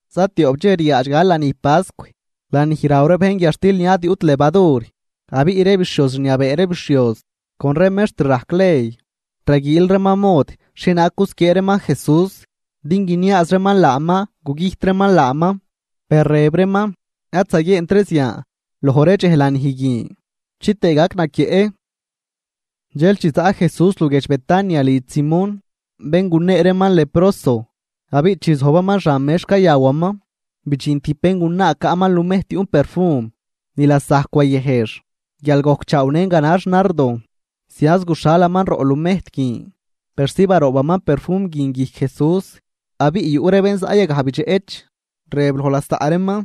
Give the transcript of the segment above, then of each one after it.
Zatioꞌp dxej riaadx gal lanij pascw, lanij raw ree bejn guiadxtil ni ad yuꞌt levadur. Abiꞌ ree bixhioz rniabee ree bixhioz con ree mext rajc ley, raguiil reeman mod xhienaag gusquiee reeman Jesús, din guiniaaz reeman laaman gugüjt reeman laaman. Per rëb reeman: ―Ad zaguieent ree zian loj ree dxej lanij guin, chitëë gac naquieꞌ. Dxel chi zaꞌ Jesús luguiedx Betania lidx Simón, bén gunee reeman leproso, abiꞌ chi zojbaman xan mex cayawaman, bidxin tijb béngunaa caꞌman lumejt yuꞌn perfum ni lasajc wayëjx guial gojcchaawnën ganax nardo, zianz guxhalaman roꞌ lumejt guin persi baroobaman perfum guin guijc Jesús. Abiꞌ yuꞌ ree bén zaꞌ yagaj bidxeꞌch, rëb loj lasaꞌ reeman: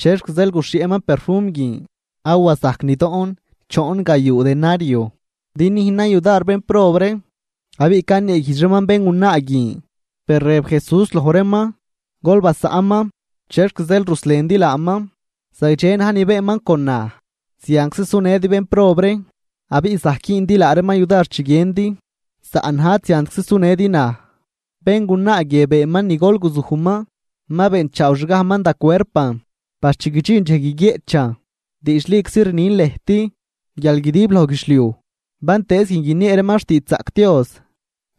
―¿Chexc zeel guxhieꞌman perfum guin? Awa zajc nidoꞌn choon gayuu denario din nüjnan yudar bénprob ree. Abiꞌ caneeguijdx reeman béngunaa guin. Per rëb Jesús loj reeman: ―Gol basaꞌnman. ¿Chexc zeel ruslendi laaman? Zagdxe na̱j ni beenman con naj. Zianczi sunëdi bénprob ree, abiꞌ zajc güündi laa reeman yudar chi guiëndi, saꞌn naj ad ziantczi sunëdi naj. Béngunaa guie beenman ni golguzujman, ma beenchaawxgajman da cuerpan par chi guidxin dxej guiguieꞌchan. Diidxliczi rnin lëjt, guial guidib loj guidxliuj bantëëz guin guiniee reeman xtiidxzaꞌc Dios,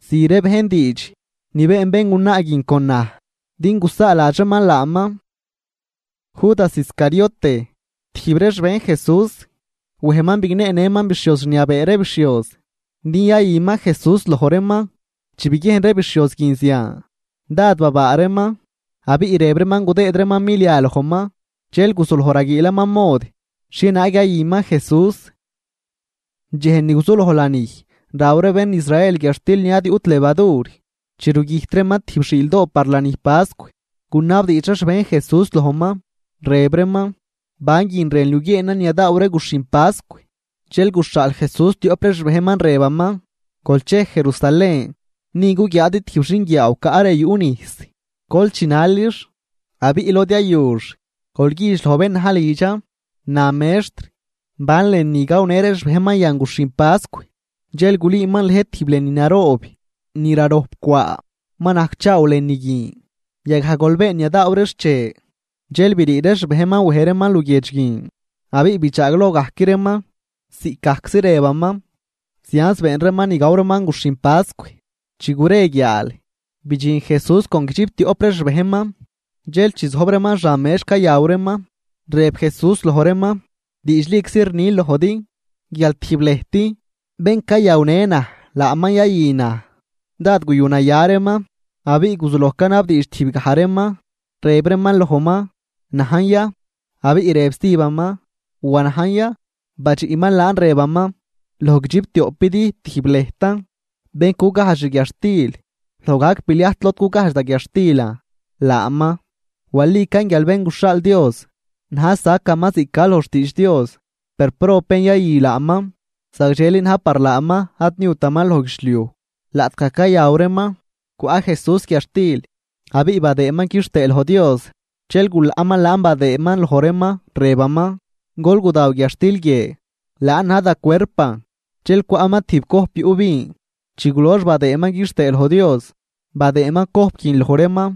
zü ree bejn diidx ni been béngunaa guin con naj din gusaaladx reeman laaman. Judas Iscariote, tijb ree xbejn Jesús, wejman bigneenëman bixhioz rniabee ree bixhioz din yayüman Jesús loj reeman. Chi biguiejn ree bixhioz guin zian, dád babaa reeman. Abiꞌ rëb reeman gudëëd reeman milia lojman. Dxel guzuloj raguiilaman mod xhienaag yayüman Jesús. Dxej ni guzuloj lanij raw ree bén Israel guiadxtil ni ad yuꞌt levadur, chi rugüjt reeman tijb xiildoo par lanij pascw, gunabdiidx ree xbejn Jesús lojman, rëb reeman: ―¿Ban guin rënl yuguieenan ni yadaaw ree guxhin pascw? Dxel guxhaal Jesús tioꞌp ree xbejnman, rëbaman: ―Gol chej Jerusalén. Ni guguiaadi tijb xinguiaaw caꞌ re yuꞌ nijs. Gol chinalix. Abiꞌ lod yayux, gol güjdx loj bén na̱j lidxan: “Na mextr: ¿Ban lënü gawnë ree xbejnman yan guxhin pascw?” Dxel gulüüman lëjt tijb lënü naroob ni rarojp cwaa, ma najcchaaw lënü guin. Yagaj gol been ni yadaaw ree xche. Dxel brii ree xbejnman wej reeman luguiedx guin, abiꞌ bidxaagloj gajc reeman ziꞌcgajczi rëbaman, zianz been reeman ni gaw reeman guxhin pascw. Chi gure guiaal, bidxin Jesús con guidxiptioꞌp ree xbejnman. Dxel chi zojb reeman xan mex cayaw reeman, rëb Jesús loj reeman: ―Diidxliczi rnin lojdi guial tijb lëjt, bén cayawnë naj, laaman yayü naj. Dád guyunaya reeman, abiꞌ guzuloj canabdiidx tijb gaj reeman, rëb reeman lojman: ―¿Najn ya? Abiꞌ rëb stijbaman: ―¿Wa najn ya? Badxiꞌman laan rëbaman: ―Loj guidxiptioꞌpidi, tijb lëjtan, bén cugajdx xguiadxtil loj gajc pliajt lod cugajdx da guiadxtilan, laaman. Walican guial Bén guxhaal Dios na̱j sacaman ziꞌc ca loj xtiidx Dios. Per, ¡prob bén yayü laaman! Zagdxeli na̱j par laaman ad niutaman loj guidxliuj Laꞌtgaj cayaw reeman, cwaꞌ Jesús guiadxtil abiꞌ badëëman quixtëë loj Dios, dxel gulaꞌman laan badëëman loj reeman, rëbaman: ―Gol gudaw guiadxtil guie, laan na̱j da cuerpan. Dxel cwaꞌman tijb cojp yuꞌ vin, chi gulox badëëman quixtëë loj Dios, badëëman cojp guin loj reeman,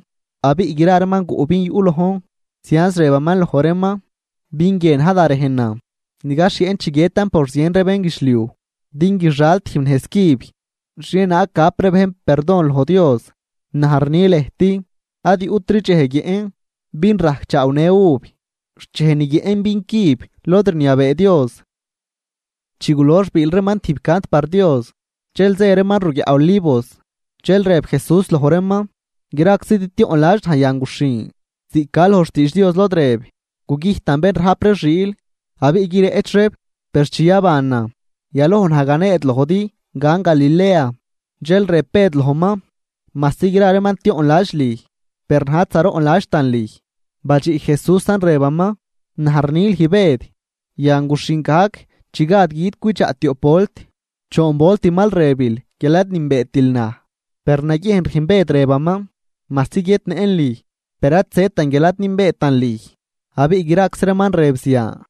abiꞌ gra reeman guꞌ vin yuꞌ lojn. Zianz rëbaman loj reeman: ―Vin guie na̱j da rejnan ni gaxhieꞌn chi guiëtan por zien ree bénguidxliuj, din guixal tijb nejz cüb xhienaag gap ree bejn perdon loj Dios. Naj rni lëjt, ad yuꞌtri dxej guiëꞌn vin rajcchaawnë uv, xt dxej ni guiëꞌn vin cüb lod rniabee Dios. Chi gulox biil reeman tijb cant par Dios. Dxel zë reeman ruguiaꞌ Olivos. Dxel rëb Jesús loj reeman: ―Graczidi tioꞌnladx naj yan guxhin, ziꞌc ca loj xtiidx Dios lod rëb: “Gugüjtan bén rajp ree xiil, abiꞌ guireꞌch reeb.” Per chi yabanan, yaloj naj ganeed lojdi gan Galilea. Dxel rëb Bëd lojman: ―Majsi gra reeman tioꞌnladx lüj, per naj ad zaroꞌnladxtan lüj. Badxiꞌ Jesúsan rëbaman: ―Naj rni lüj Bëd, yan guxhin gajc chi gad gui̱d cwidxaꞌ tioꞌp volt, choon volt mal rëbil guial ad nünbeetil naj. Per naguiejn rüjn Bëd rëbaman: ―Majsi guiëtnëꞌn lüj, per ad zëtan guial ad nünbeetan lüj. Abiꞌ graczi reeman rëb zian.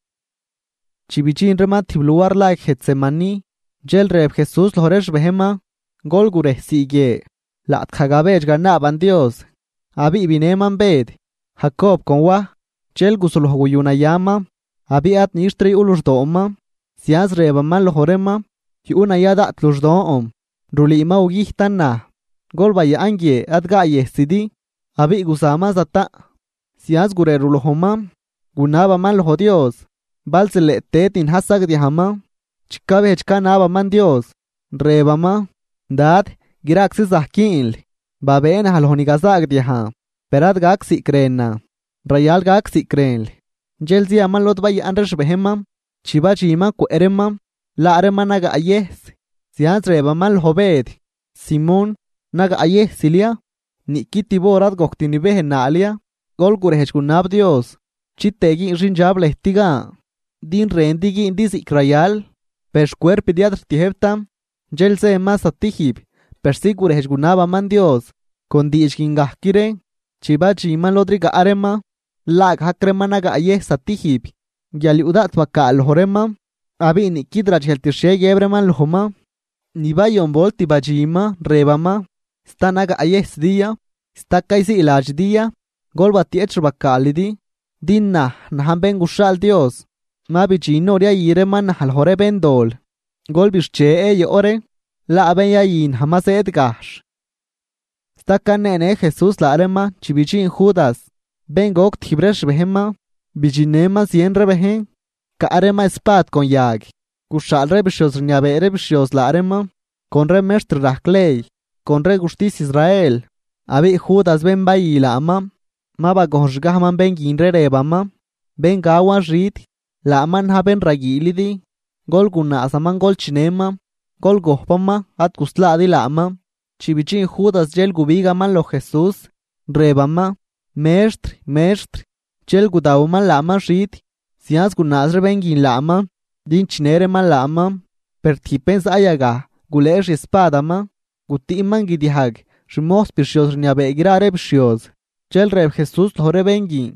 Chi bidxin reeman tijb luar la Getsemaní, dxel rëb Jesús loj ree xbejnman: ―Gol gurejsii guie, laꞌtgaj gabedx ganaaban Dios. Abiꞌ binëman Bëd, Jacob con Waj, dxel guzuloj guyunayaman abiꞌ ad nixtri yuꞌ luxdooman. Zianz rëbaman loj reeman: ―Yuꞌ naya daꞌt luxdon, rulüü ma gugüjtan naj. Gol bayaꞌn guie ad gaayëjsidi. Abiꞌ guzaman zataꞌn, zianz gurerulojman, gunabaman loj Dios, bal zileꞌ tëd ni na̱j sagdiajman. Chi cabejdx canabaman Dios, rëbaman: ―Dad, graczi zajc güünl. Babëë naj loj ni gazaagdiajn. Per ad gac ziꞌc rënan, rayal gac ziꞌc rënl. Dxel ziaman lod bayaꞌn ree xbejnman, chi badxinman cwëꞌ reeman laa reeman nagaꞌyëjs, zianz rëbaman loj Bëd: ―Simón, ¿nagaꞌyëjsil ya? ¿Niꞌqui tib hor ad gojct nibejnaal ya? Gol gurenaa, gol gurejdx gunab Dios chitëë güün xindxab lëjt gan. Din rëndi güündi ziꞌc rayal, per xcuerpidi ad rtiëjbtan. Dxel zëman zatijb persi gurejdx gunabaman Dios con diidx guin gajc ree. Chi badxinman lod rigaꞌ reeman, laagajc reeman nagaꞌyëjs zatijb, guial yuꞌ daꞌt bacaal loj reeman, abiꞌ niꞌquid radxejlt xhie guiëb reeman lojman. Ni bayon volt badxinman, rëbaman: ―¿Sta nagaꞌyëjsidi ya? ¿Sta cayziiladxidi ya? Gol batieꞌch xbacaalidi din naj, najn Bén guxhaal Dios ma bidxin hor yayü reeman naj loj ree béndol. Gol bixche, yoꞌ ree, laa bén yayü naj ma zëëd gajxh. Sta caneenë Jesús laa reeman chi bidxin Judas, bén goc tijb ree xbejnman. Bidxinnëman zien ree bejn caꞌ reeman espad con yag, guxhaal ree bixhioz rniabee ree bixhioz laa reeman con ree mextr rajc ley con ree guxtis Israel. Abiꞌ Judas bén bayü laaman ma bagojnxgajman bén guin ree rëbaman: ―Bén gawan xid, laaman na̱j bén raguiilidi, gol gunaazaman gol chinëman, gol gojpaman ad guslaadi laaman. Chi bidxin Judas dxel gubigaman loj Jesús, rëbaman: ―Mextr, Mextr. Dxel gudawaman laaman xid. Zianz gunaaz ree bén guin laaman din chinë reeman laaman. Per tijb bén zaꞌ yagaj gulëë xiespadaman, gutüꞌman guidiajg xmojs bixhioz rniabee gra ree bixhioz. Dxel rëb Jesús loj ree bén guin: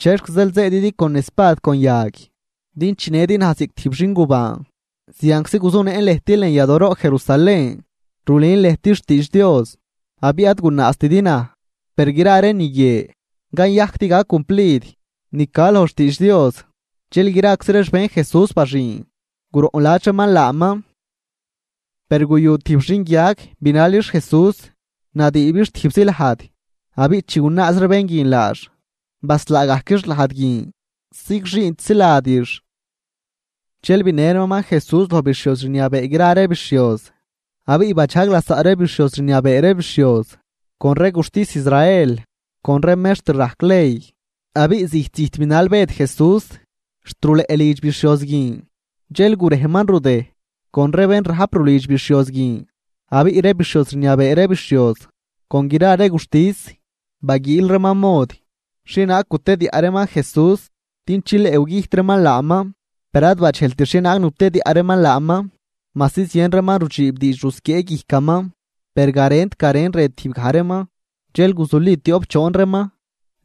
―¿Chexc zeel zëëdidi con espad con yag din chinëdi naj ziꞌc tijb xingubaan? Zianczi guzunëꞌn lëjt lën yadooroꞌ Jerusalén rulün lëjt xtiidx Dios, abiꞌ ad gunaaztidi naj. Per gra ree ni guie cayajc din gac cumplid ni ca loj xtiidx Dios. Dxel graczi ree xbejn Jesús baxüün, guroꞌnladx reeman laaman. Per guyu tijb xinguiag binalix Jesús, nadüübix tijbzi lajd. Abiꞌ chi gunaaz ree bén guin laax, baslaagajquix lajd guin, zigxüünt ziladix. Dxel binë reeman Jesús loj bixhioz rniabee gra ree bixhioz, abiꞌ badxaag lasaꞌ ree bixhioz rniabee ree bixhioz con ree guxtis Israel con ree mextr rajc ley. Abiꞌ zijt zijt binal Bëd Jesús xt ruleꞌ lidx bixhioz guin, dxel gurejman rudëj con ree bén rajp rulidx bixhioz guin, Abiꞌ ree bixhioz rniabee ree bixhioz con gra ree guxtis, baguiil reeman mod xhienaag gutediaꞌ reeman Jesús din chileꞌ gugüjt reeman laaman, per ad badxejlt xhienaag nutediaꞌ reeman laaman, majsi zien reeman rudxiib diidx rusquiee guijcaman, per garent garen rëb tijb gaj reeman. Dxel guzuli tioꞌp choon reeman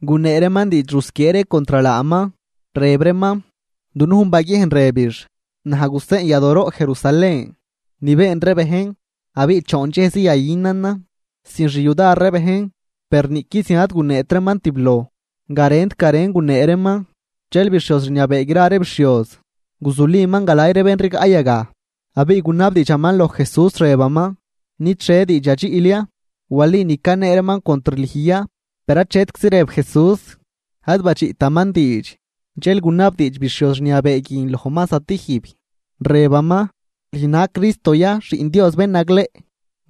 gunee reeman diidx rusquiee ree contr laaman, rëb reeman: ―Dunujn baguiejn rëbix: “Naj guseꞌn yadooroꞌ Jerusalén ni been ree bejn, abiꞌ choon dxejzi yayünanan sin xyudar ree bejn.” Per niꞌqui zian ad guneet reeman tibloj, garent garen gunee reeman. Dxel bixhioz rniabee gra ree bixhioz guzuliman galay ree bén rigaꞌ yagaj, abiꞌ gunabdiidxaman loj Jesús, rëbaman: ―¿Nid xhie diidx yadxiꞌl ya? ¿Wali ni canee reeman contr lüj ya? Per achetczi rëb Jesús, ad badxiꞌtaman diidx, dxel gunabdiidx bixhioz rniabee guin lojman zatijb, rëbaman: ―¿Lüj na̱j Cristo ya, Xiꞌn Dios Bén nagleꞌ?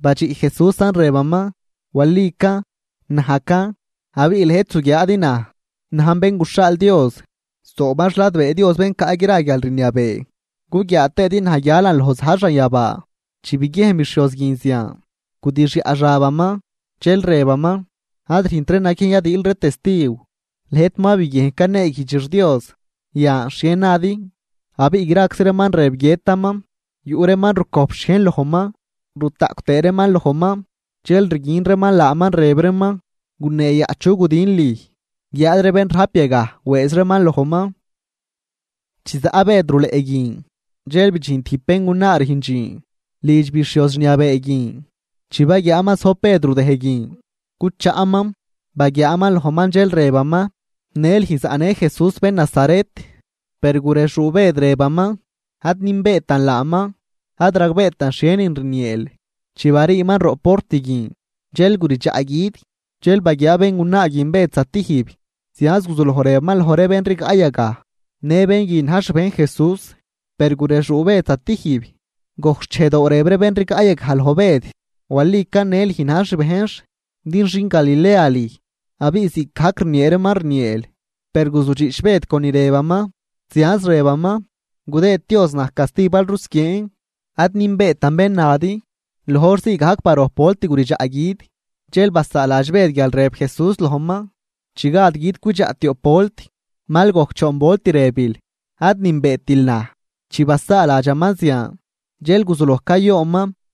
Badxiꞌ Jesúsan rëbaman: ―Walican, najcan. Abiꞌ lëjt zuguiaadi naj najn Bén guxhaal Dios zooban xladbee Dios Bén caꞌ gra guialrniabee guguiaa tëëdi naj guialan loj za̱j xanyabaa. Chi biguiejn bixhioz guin zian, gudixyaꞌ xabaman, dxel rëbaman: ―Ad rüjntri naguiejn yadiil ree testiw. Lëjt ma biguiejn caneeguijdxix Dios. Yan, ¿xhie nadi? Abiꞌ graczi reeman rëb, guiëtaman. Yuꞌ reeman rucojp xhiejn lojman, rutaꞌcw tëë reeman lojman, dxel riguin reeman laaman, rëb reeman: ―¡Guneeyaꞌ chu gudin lüj! Guiáad ree bén rajp yagaj wëëz reeman lojman. Chi zaꞌ Bëd ruleꞌ guin, dxel bidxin tijb béngunaa rüjn dxiin lidx bixhioz rniabee guin. Chi baguiaaman zojb Bëd rudëj guin cuchaꞌman, baguiaaman lojman, dxel rëbaman: ―Në lüj zaꞌnë Jesús bén Nazaret. Per gurexuu Bëd rëbaman: ―Ad nünbeetan laaman, ad ragbeetan xhienin rnieel. Chi bariiman roꞌ port guin, dxel guridxaꞌ gui̱d. Dxel baguiaa béngunaa guin Bëd zatijb, zianz guzuloj rëbaman loj ree bén rigaꞌ yagaj: ―Në bén guin na̱j xbejn Jesús. Per gurexuu Bëd zatijb. Gojc xchejdoo rëb ree bén rigaꞌ yagaj loj Bëd: ―Walican në lüj na̱j xbejnx din xin Galilea lüj, abiꞌ ziꞌcgajc rniee reeman rnieel. Per guzudxiꞌch Bëd con ni rëbaman, zianz rëbaman: ―Gudëëd Dios naj casti bal rusquieen, ad nünbeetan bén nadi. Loj hor zii gajc barojp volt guridxaꞌ gui̱d. Dxel basaaladx Bëd guial rëb Jesús lojman: “Chi gad gui̱d cwidxaꞌ tioꞌp volt, mal gojc choon volt rëbil ad nünbeetil naj.” Chi basaaladxaman zian, dxel guzuloj cayoonman.